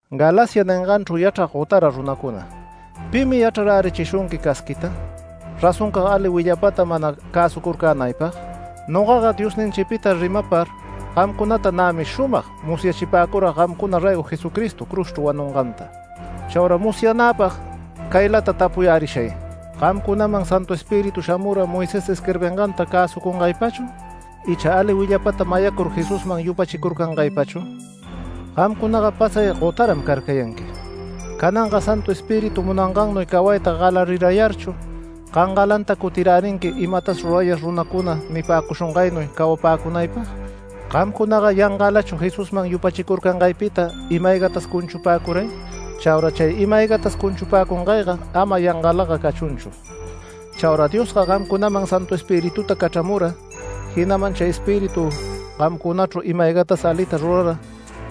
¡Galacia ninganchru yachrag gotara runacuna! ¿Pimi yachrarärichishunqui casquiyta, razoncag ali willapata mana cäsucurcänaypag? Nogaga Diosninchipita rimapar gamcunata nämi shumag musyachipäcurag gamcuna raygo Jesucristo cruzchru wanunganta. Chaura musyanäpag caylata tapuyärishay: ¿Gamcunaman Santu Espíritu shamura Moisés isquirbinganta cäsucungaypachu icha ali willapata mayacur Jesusman yupachicurcangaypachu? Gamcunaga pasay gotaram carcayanqui. ¡Cananga Santu Espíritu munangannuy cawayta galarirayarchu, gangalanta cutirärinqui imatas rurayar runacuna nipäcushungaynuy cawapäcunaypag! ¿Gamcunaga yangalachu Jesusman yupachicurcangaypita ima-aygatas cunchupäcuray? Chaura chay ima-aygatas cunchupäcungayga ama yangalaga cachunchu. Chaura Diosga gamcunaman Santu Espirituta cachramura, jinaman chay Espíritu gamcunachru ima-ayga alitas rurara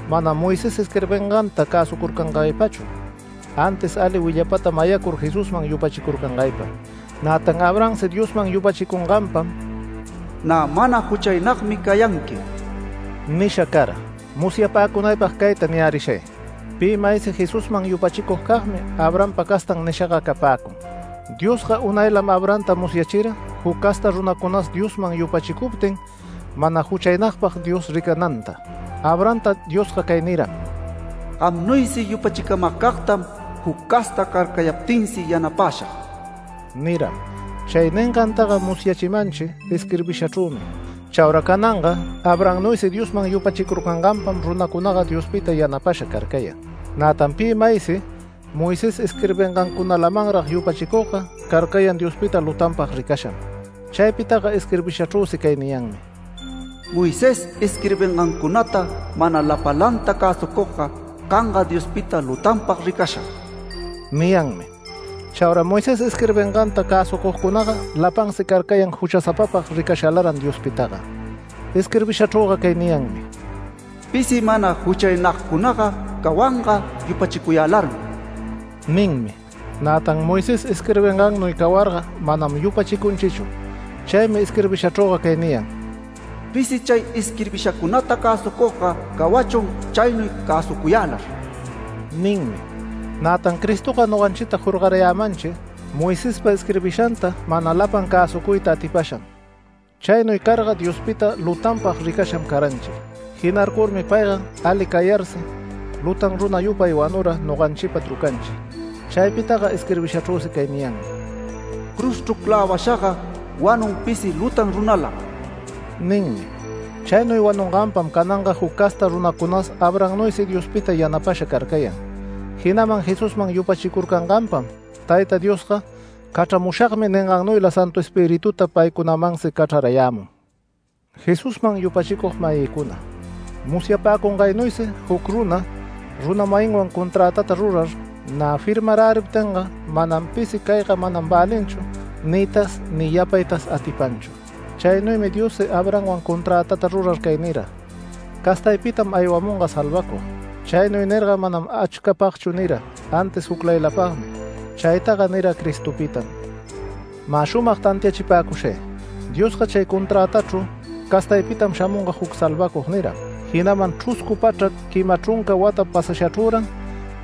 manam Moisés isquirbinganta cäsucurcangaypachu, antis ali willapata mayacur Jesusman yupachicurcangaypam. Nätan Abrahamsi Diosman yupachicunganpam “Nä mana juchaynagmi cayanqui” nisha cara. Musyapäcunaypag cayta niyärishay: Pi maysi Jesusman yupachicugcagmi “Abrahampa castan” nishaga capäcun. Diosga unaylam Abrahamta musyachira juc casta runacunas Diosman yupachicuptin mana juchaynagpag Dios ricananta. Abrahamta Diosga cay niram: “Gamnuysi yupachicamagcagtam juc casta carcayaptinsi yanapäshag” niram. Chay ningantaga musyachimanchi isquirbishachrümi. Chaura cananga Abrahamnuysi Diosman yupachicurcanganpam runacunaga Diospita yanapasha carcayan. Nätan pi maysi Moisés isquirbingancunalamanrag yupachicugga carcayan Diospita lutanpag ricasham. Chaypitaga isquirbishachrüsi cay niyanmi: “Moisés isquirbingancunata mana lapalanta cäsucugga canga Diospita lutanpag ricasham” niyanmi. Chaura Moisés isquirbinganta cäsucugcunaga lapansi carcayan juchasapapag ricashalaran Diospitaga. Isquirbishachrüga cay niyanmi: “Pisi mana juchaynagcunaga cawanga yupachicuyälarmi” ninmi. Nätan Moisés isquirbingannuy cawarga manam yupachicunchichu. Chaymi isquirbishachrüga cay niyan: “Pisi chay isquirbishacunata cäsucugga cawachun chaynuy cäsucuyälar” ninmi. Nätan Cristoga noganchita jorgarayämanchi Moisespa isquirbishanta mana lapan cäsucuyta atipasham. Chaynuy carga Diospita lutanpag ricasham caranchi. Jinarcurmi payga ali cayarsi lutan runa yupay wanura noganchipa trucanchi. Chaypitaga isquirbishachrüsi cay niyanmi: “Cruzchru clävashaga wanun pisi lutan runalam” ninmi. Chaynuy wanunganpam cananga juc casta runacunas Abrahamnuysi Diospita yanapasha carcayan, jinaman Jesusman yupachicurcanganpam Tayta Diosga “Cachramushagmi” ningannuyla Santu Espirituta paycunamansi cachrarayämun. Jesusman yupachicug-mayïcuna, musyapäcungaynuysi juc runa, runa-mayinwan conträtata rurar, nä firmaräriptinga manam pisi “Cayga manam välinchu” niytas ni yapaytas atipanchu. Chaynuymi Diossi Abrahamwan conträta rurar cay nira: “Castaypitam aywamunga salvacug”. Chaynuy nirga manam achcapagchu nira, antis juclaylapagmi. Chaytaga nira Cristopitam. Mä shumag tantiachipäcushay: Diosga chay conträtachru “Castaypitam shamunga juc salvacug” niram. Jinaman chruscu pachrac quima chrunca wata pasashachrüran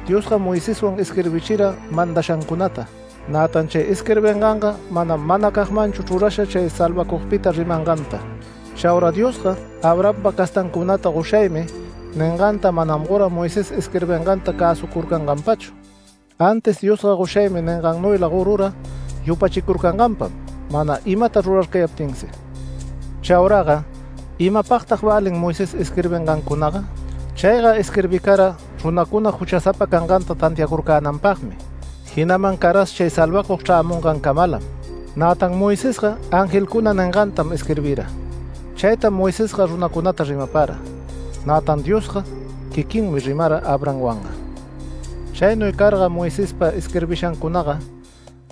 Diosga Moiseswan isquirbichira mandashancunata. Nätan chay isquirbinganga manam manacagmanchu chrurasha chay salvacugpita rimanganta. Chaura Diosga Abrahampa castancunata “Goshaymi” ninganta manam gora Moisés isquirbinganta cäsucurcanganpachu. Antis Diosga “Goshaymi” ningannuyla gorura yupachicurcanganpam mana imata rurarcayaptinsi. Chauraga ¿imapagtag välin Moisés isquirbingancunaga? Chayga isquirbicara runacuna juchasapa canganta tantiacurcänanpagmi, jinaman caras chay salvacug chrämungancamalam. Nätan Moisesga angelcuna ningantam isquirbira. Chaytam Moisesga runacunata rimapara. Nätan Diosga quiquinmi rimara Abrahamwanga. Chaynuy carga Moisespa isquirbishancunaga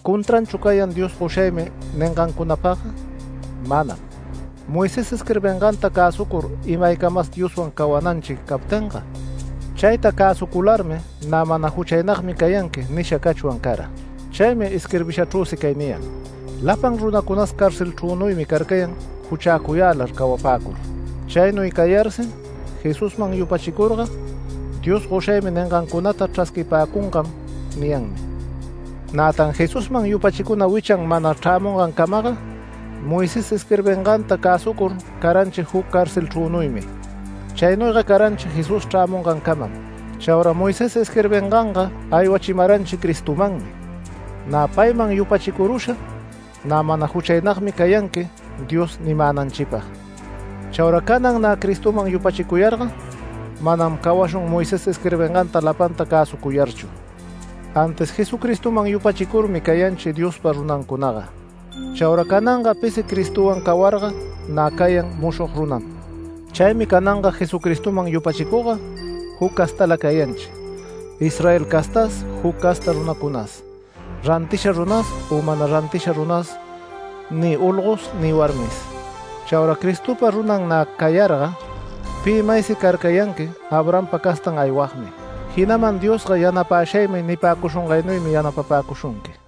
¿contranchu cayan Dios “Goshaymi” ningancunapagga? Manam. Moisés isquirbinganta cäsucur imaycamas Dioswan cawananchi captinga, chayta cäsucularmi “Nä mana juchaynagmi cayanqui” nisha cachwan cara. Chaymi isquirbishachrüsi cay niyan: “Lapan runacunas carcelchrünuymi carcayan juchäcuyälar cawapäcur”. Chaynuy cayarsi Jesusman yupachicurga, Dios “Goshaymi” ningancunata chrasquipäcungam niyanmi. Nätan Jesusman yupachicuna wichan mana chrämungancamaga Moisés isquirbinganta cäsucur caranchi juc carcelchrünuymi. Chaynuyga caranchi Jesús chrämungancamam. Chaura Moisés isquirbinganga aywachimaranchi Cristomanmi, nä payman yupachicurusha “Nä mana juchaynagmi cayanqui” Dios nimänanchipag. Chaura canan nä Cristoman yupachicuyarga, manam cawashun Moisés isquirbinganta lapanta cäsucuyarchu. Antis Jesucristoman yupachicurmi cayanchi Diospa runancunaga. Chaura cananga pisi Cristowan cawarga nä cayan mushog runam. Chaymi cananga Jesucristoman yupachicugga juc castala cayanchi, Israel castas juc casta runacunas, rantisha runas u mana rantisha runas ni olgos ni warmis. Chaura Cristopa runan nä cayarga pi maysi carcayanqui Abrahampa castan aywagmi, jinaman Diosga “Yanapäshaymi”, nipäcushungaynuymi yanapapäshunqui.